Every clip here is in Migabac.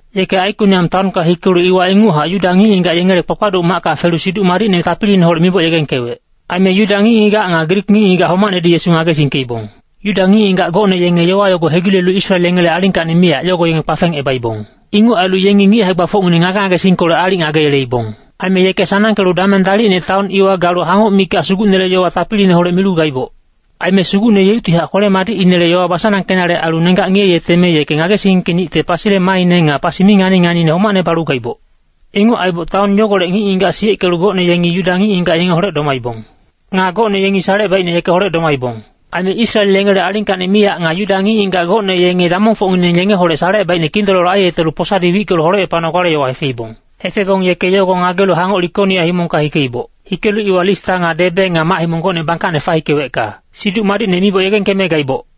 Yeke Aikoniam taonka hikelu iwa inguchac Yuda ngic-ngigac yengele kpakpaduc macka felu Siduc Madicne tapiliineholec miboc yegengkewec. Aime Yuda ngic-ngigac nga Grik ngic-ngigac homacnedi Yesu ngagesingkeibong. Yuda ngic-ngigac gocne yenge yowa yogo hegilelu Israel yengele alingkacni miyac yogo yenge kpafengebaibong. Inguc ailu yengi ngic hae-gbafocngineng ngage-ngagesingkolec aalic ngageyeleibong. Aime yeke sanangkelu dameng dalicne taon iwa galu hangoc mikac Sugucnele yowa tapiliineholec milu gaiboc. Aime Sugucne yeuctihac kwele-madicinele yowa basanangkenale ailu nenggac ngiyeyeteme yeke ngagesingkeningte pasile maaine nga pasi mi ngani-nganiine homacne balu gaiboc. Inguc aiboc taon yogolec ngic-ngigac siyeckelu gocne yengi Yuda ngic-ngigac yengeholec domaibong. Nga gocne yengi salecebaicne yekeholec domaibong. Aime Israel yengele alingkacni miyac nga Yuda ngic-ngigac gocne yenge damongfocngineng yengeholec salecebaicne kindololo aiyetelu posadi wickelu holecepanogale yowa hefeibong. Hefebong yeke yogo ngagelu hangoc Likonia himongka hikeiboc. Hikelu iwa Lista nga Debe nga mac-himong gocne bangkacne fahikewecka Siduc Madicne miboc yegengkeme gaiboc.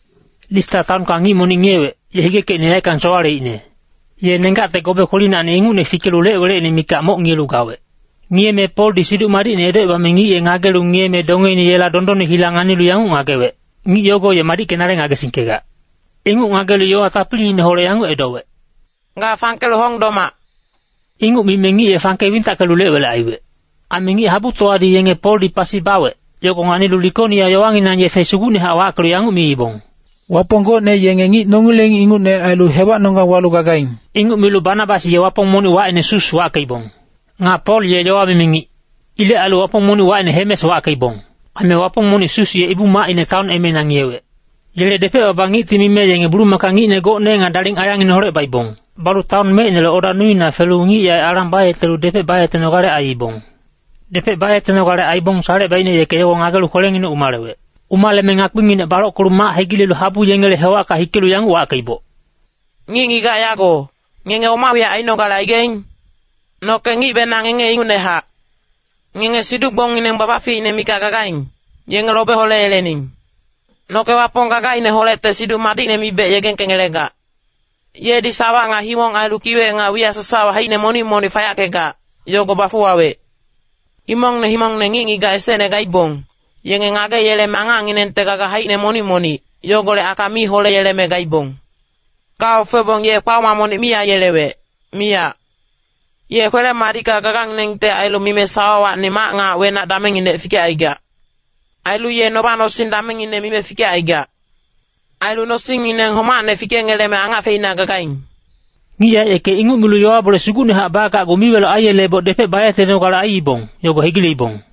Lista taonka ngic monic ngiyewec, ye higekecine yaeckang sowaleicne. Ye nenggacte gobe kwelinacni ingucne fikelu lec-welecine mikac moc ngiyelu gawec. Ngiyeme Poldi Siduc Madicne edocebame ngic ye ngagelu ngiyeme dongeine yela dondonne hila nganilu yanguc ngagewec, “Ngic yogo ye madickenale ngagesingkegac.” Inguc ngagelu yowa tapiliineholec yanguc edowec, “Ga fangkelu hong domac.” Inguc mime ngic ye fangke wintackelu lec-welec aiwec. Aime ngic-habutowadi yenge Poldi pasi bawec, yogo nganilu Likonia yowanginang yefe sugucnehac wackelu yanguc miibong, “Wapong gocne yenge ngic nongileng ingucne ailu hewacnonggang walu gagaing.” Inguc milu Banabas ye wapong monic wacine Sus wackeibong. Nga Pol ye yowa mimi ngic. Ilec ailu wapong monic wacine Hemes wackeibong. Aime wapong monic Sus ye ibu-macine taon emeina ngiyewec. Yele depec-baba ngicti mime yenge bulumaka ngicne gocne nga daling ayangineholec baibong. Balu taon mecinele oda nuina felu ngic yaec alang bayetelu depec bayetenogale aiibong. Depec bayetenogale aibong salecebaicne yeke yogo ngagelu kwelenginec umalewec. Umaleme ngakpinginec balockelu mac hegilelu habu yengele hewacka hikelu yanguc wackeiboc, “Ngic-ngigac yago, ngenge oma wiyac ainogale aigaing? Noke ngicbenang ngenge ingucnehac. Ngenge siduc-gbongngineng babaficine mikac gagaing, yenge lobe holeyelening. Noke Wapong gagaineholecte Siduc Madicne mibec yegengkengelegac. Yedi sawa nga himong ailu kiwec nga wiyac sasawa haicine monic-monic fayackegac, yogo bafuwawec. Himongne himongne ngic-ngigac esecne gaibong, yenge ngageyeleme angacnginengte gaga haicine monic-monic, yogolec aka mi holeyeleme gaibong. Gaofebong ye kpaoma monic mi aiyelewec, miyac. Ye kwele-madicka gaganginengte ailu mime sawawacni mac nga wenac damengnginec fikecaigac. Ailu ye noba-nosing damengngine mime fikecaigac. Ailu nosingngineng homacne fikengeleme angac feina gagaing.” Ngic yaec yeke inguc milu yowa-bole sugucnehac bagacgu miweloc aiyeleboc depec bayetenogale aiibong, yogo hegileibong.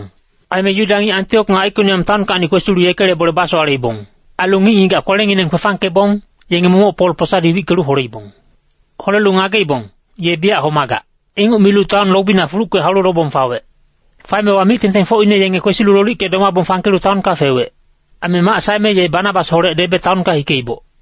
Aime Yuda ngic Antiok nga Aikoniam taonkacni kwesilu yekele bole basowaleibong. Ailu ngic-ngigac kwelengineng kwefangkebong, yenge momoc Pol posadi wickelu holeibong. Holelu ngageibong, “Ye biyac homagac.” Inguc milu taon lobina fulucke haulu lobong fawec. Faemewa mic-tengtengfocine yenge kwesilu lolicke domabong fangkelu taonka fewec. Aime mac saeme ye Banabasholec Debe taonka hikeiboc.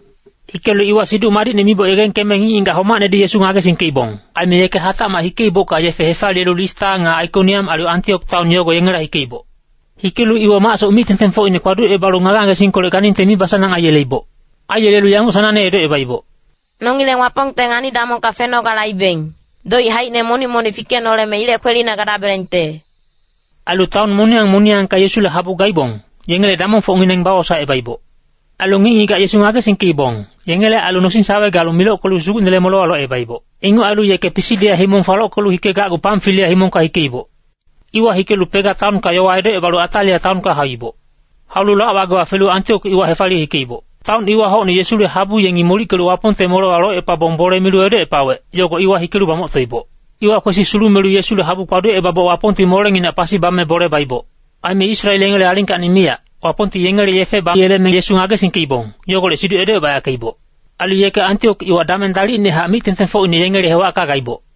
Hikelu iwa Siduc Madicne miboc yegengkeme ngic-ngigac homacnedi Yesu ngagesingkeibong. Aime yeke hatacmac hikeibocka yefe hefaliyelu Lista nga Aikoniam ailu Antiok taon yogo yengela hikeiboc. Hikelu iwa macsoc mic-tengtengfocine kpaducebalu ngage-ngagesingkolec ganingte mibasanang aiyeleiboc. Aiyelelu yanguc sanangne edocebaiboc, “Nongileng Wapongte ngani-damongka fenogale aibeng, doic haicine monic-monic fikenoleme ilec kwelina gadabelengte.” Ailu taon moniyang moniyangka Yesule habu gaibong, yengele damongfocngineng bawosaecebaiboc. Ailu ngic-ngigac Yesu ngagesingkeibong, yengele ailu nosing-sawe galu milockelu Sugucnele molewa locebaiboc. Inguc ailu yeke Pisidia himong falockelu hikegacgu Pamfilia himongka hikeiboc. Iwa hikelu Pega taonka yowa edocebalu Atalia taonka hauiboc. Haulu lac-wagewa felu Antiok iwa hefaliye hikeiboc. Taon iwa hocne Yesule habu yengi molickelu Wapongte molewa locepabong bole milu edocepawec, yogo iwa hikelu bamoctoiboc. Iwa kwesi sulumelu Yesule habu kpaducebaboc Wapongti molenginac pasi bame bole baiboc. Aime Israel yengele alingkacni miyac, Wapongti yengele yefe bayeleme Yesu ngagesingkeibong, yogolec siduc edocebayackeiboc. Ailu yeke Antiok iwa dameng dalicnehac mic-tengtengfocine yengele hewacka gaiboc.